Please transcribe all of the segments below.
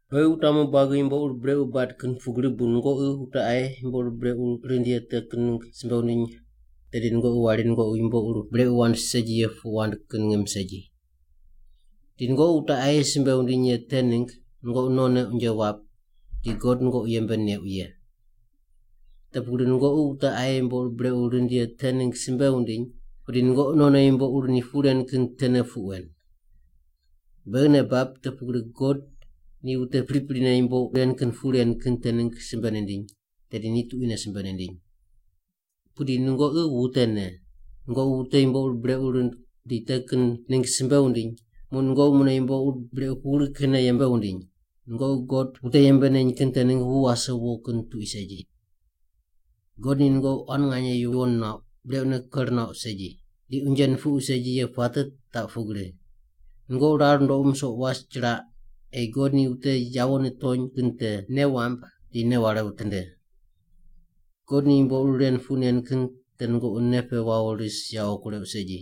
Beghi wutamu buagi yumbo ur brequ bad kin pugri bu nungoqi wute aye yumbo ur brequ rind ye te kin ningg simbe wundiny, tedi nungoqi wari nungoqi yumbo ur brequ wand segi ye puq wand kin ngim segi. Di nungoqi wute aye simbe wundiny ye te ningg nungoqi nonne unje wap di God nungoqi yembe neuq ye. Te pugri nungoqi wute aye yumbo ur brequ rind ye te ningg simbe wundiny, pudi nungoqi nonne yumbo ur ni puq ren kin tene puq wen. Beghi nei bab te pugri God ni wute priprine yumbo ren kin puq ren kin te ningg simbe nindiny, tedi ni tuquine simbe nindiny. Pudi nungoqi wutene, nungoqi wute yumbo ur brequ rind di te kin ningg simbe wundiny, muq nungoqi mune yumbo ur brequ pugri kinne yembe wundiny! Nungoqi God wute yembe neny kin te ningg wu wase wo kin tuqui segi. God ni nungoqi quan nganye yuwon nuauq, brequne ker nuauq segi, di unje nupuqu segi ye puate taq pugri: Nungoqi rar nundoqu musoq was chiraq ei God ni wute yawo nitony kin te nei wamb di nei ware witinde. God ni yumbo ur ren puq nen kin te nungoqi nei pe wawo ris yawo kureuq segi.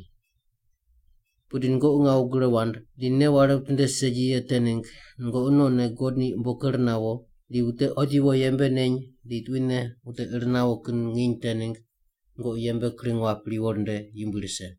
Pudi nungoqi ngawu gre wand di nei ware witinde segi ye te ningg nungoqi nonne God ni umbo ker nawo di wute otiwo yembe neny di tuquine wute ir nawo kin nginy te ningg nungoqi yembe kring wap riwo rinde yumbui rise.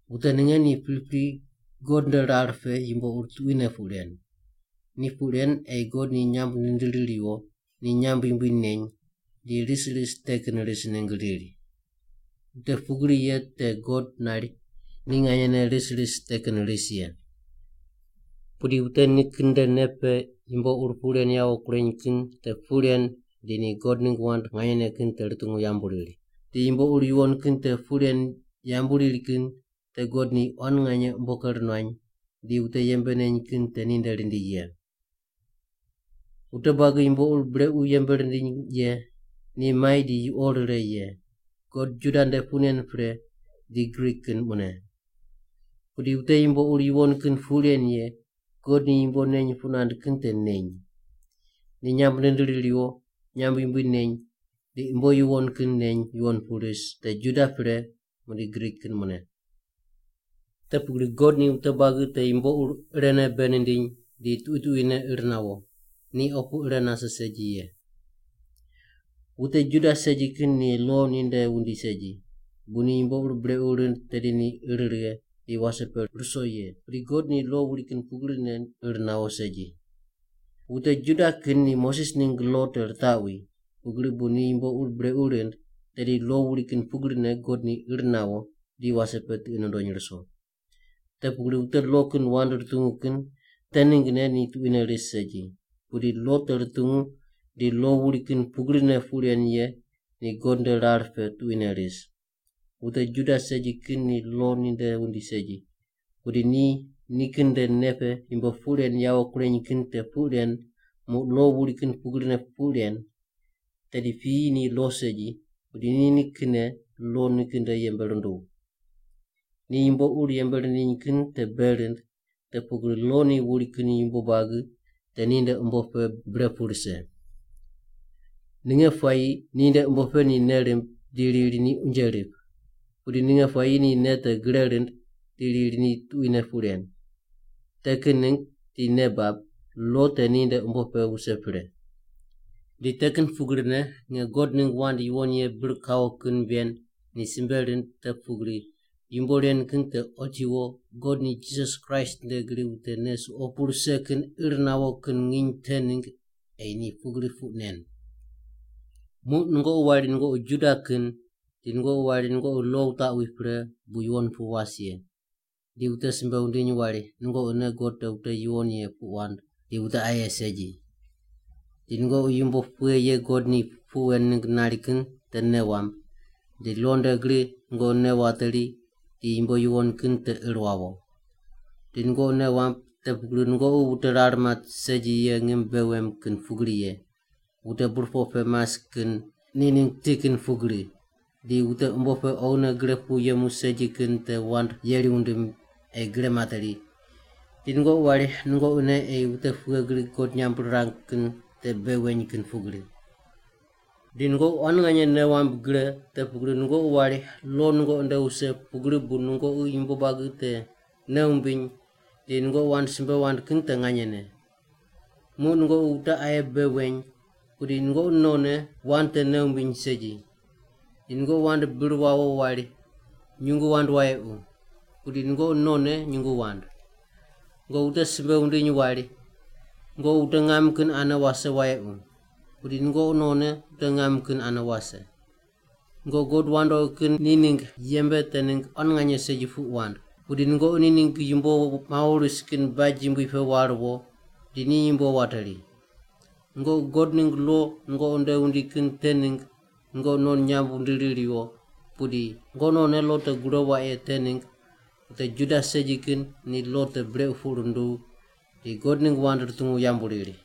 Wute ninge ni pripri God nde rar pe yumbo ur tuquine puq ren. Ni puq ren ei God ni nyamb nindiri riwo, ni nyamb yumbui neny, di ris ris te kin ris ningg riri. Wute pugri ye te God nari ni nganyene ris ris te kin ris ye. Pudi wute nikin nde nei pe yumbo ur puq ren yawo kureny kin te puq ren di ni God ningg wand nganyene kin te rutungu yambu riri, di yumbo ur yuwon kin te puq ren yambu riri kin te God ni quan nganye umbo ker nuany di wute yembe neny kin te ninde rindi ye. Wute buagi yumbo ur brequ yembe rindiny ye ni mai di yuqo rire ye, God Juda nde puq nen pre, di Grik kin mune. Pudi wute yumbo ur yuwon kin puq ren ye, God ni yumbo neny puq nand kin te neny. Ni nyamb nindiri riwo, nyamb yumbui neny, di umbo yuwon kin neny yuwon pu ris, te Juda nde pre muqdi Grik kin mune. Te pugri God ni wute buagi te yumbo ur irene bei nindiny di tuqui tuquine ir nawo, ni opu ire nase segi ye. Wute Juda segi kin ni lo ninde wundi segi bu ni yumbo ur brequ rind tedi ni ir righe di wase pe ruso ye, pudi God ni lo wuri kin pugrine ir nawo segi. Wute Juda kin ni Moses ningg lo te ritaqwi, pugri bu ni yumbo ur brequ rind, tedi lo wuri kin pugrine God ni ir nawo di wase pe tiqi nundony ruso. Te pugri wute lo kin wand rutungu kin te ninggne ni tuquine ris segi, pudi lo te rutungu di lo wuri kin pugrine puq ren ye ni God nde rar pe tuquine ris. Wute Juda segi kin ni lo ninde wundi segi pudi ni nikin nde nei pe yumbo puq ren yawo kureny kin te puq ren muq lo wuri kin pugrine puq ren, tedi piyi ni lo segi, pudi ni nikinne lo nikin nde yembe runduw. Ni yumbo ur yembe rindiny kin te bei rind te pugri lo ni wuri kin yumbo buagi te ninde umbo pe bre pu rise. Ninge puayi ninde umbo pe ni nei rimb di riri ni unje rip. Pudi ninge puayi ni nei te gre rind, di riri ni tuquine puq ren. Te kin ningg di nei bab, lo te ninde umbo pe wuse pre. Di te kin pugrine nge God ningg wand yuwon ye bir kawo kin ven ni simbe rind te pugri yumbo ren kin te otiwo God ni Jisas Kraist nde gri wute nei suqo pu rise kin ir nawo kin nginy te ningg ei ni pugri puq nen. Muq nungoqi wari nungoqi Juda kin, di nungoqi wari nungoqi lo wutaqwi pre bu yuwon pu was ye, di wute simbe wundiny wari nungoqine God te wute yuwon ye puq wand di wute aye segi. Di nungoqi yumbo pughe ye God ni puq wen ningg nari kin te nei wamb, di lo nde gri nungoqi nei wateri di yumbo yuwon kin te ir wawo. Di nungoqi nei wamb te pugri nungoqi wute rar mat segi ye ngim bei wem kin pugri ye, wute burpoq pe mas kin ni ningg ti kin pugri, di wute umbo pe oghine gre pu yemu segi kin te wand yeri wundim ei gre materi, di nungoqi wari nungoqine ei wute pughe gri God nyamb rirang kin te bei weny kin pugri. Di nungoqi quan nganye nei wamb gre te pugri nungoqi wari lo nungoqi nde wuse pugri bu nungoqi yumbo buagi te nei wumbiny di nungoqi wand simbe wand kin te nganyene. Muq nungoqi wute aye bei weny-pudi nungoqi nonne wand te nei wumbiny segi. Di nungoqi wand bir wawo wari, “Nyungu wand wayequ” - pudi nungoqi nonne nyungu wand. Nungoqi wute simbe wundiny wari, “Nungoqi wute ngam kin ane wase wayequ.” Pudi nungoqi nonne wute ngam kin ane wase. Nungoqi god wandoqi kin ni ningg yembe te ningg quan nganye segi puq wand, pudi nungoqi ni ningg yumbo mawo ris kin baj yumbui pe war wo di ni yumbo wateri. Nungoqi God ningg lo nungoqi nde wundi kin te ningg nungoqi non nyamb wundiri riwo, pudi nungoqi nonne lo te gure waq ye te ningg wute Juda segi kin ni lo te brequ puq runduw di God ningg wand rutungu yambu riri.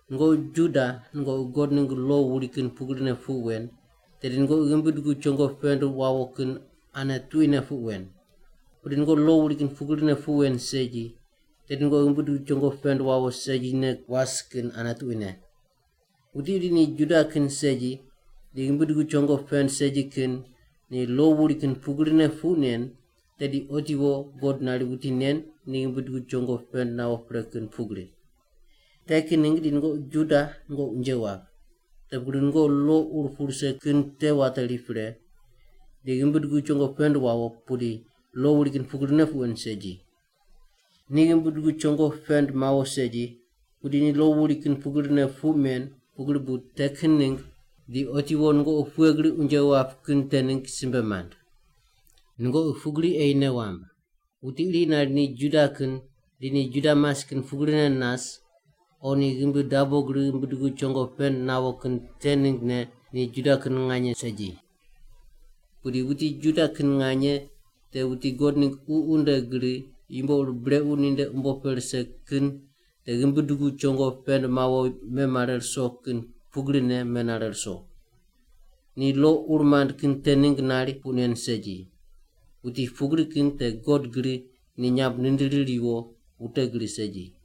Nungoqi Juda nungoqi God ningg lo wuri kin pugrine puq wen, tedi nungoqi ghimbi dugu chongo pend wawo kin ane tuquine puq wen. Pudi nungoqi lo wuri kin pugrine puq wen segi, tedi nungoqi ghimbi dugu chongo pend wawo segine was kin ane tuquine. Wuti iri ni Juda kin segi di ghimbi dugu chongo pend segi kin ni lo wuri kin pugrine puq nen, tedi otiwo God nari wuti nen ni ghimbi dugu chongo pend nawo pre kin pugri. Te kin ningg di nungoqi Juda nungoqi unje wap, te pugri nungoqi lo ur pu rise kin te wateri pre di ghimbi dugu chongo pend wawo pudi lo wuri kin pugrine puq wen segi. Ni ghimbi dugu chongo pend mawo segi, pudi ni lo wuri kin pugrine puq men, pugri bu te kin ningg di otiwo nungoqi pughe gri unje wap kin te ningg simbe mand. Nungoqi pugri ei nei wamb. Wuti iri nari ni Juda kin di ni Juda mas kin pugrine nas, o ni ghimbi dabo gri ghimbi dugu chongo pend nawo kin te ninggne ni Juda kin nganye segi. Pudi wuti Juda kin nganye te wuti God ningg Ququ nde gri yumbo ur brequ ninde umbo pe rise kin te ghimbi dugu chongo pend mawo memare ruso kin pugrine menare ruso. Ni lo ur mand kin te ningg nari puq nen segi. Wuti pugri kin te God gri ni nyamb nindiri riwo, wute gri segi.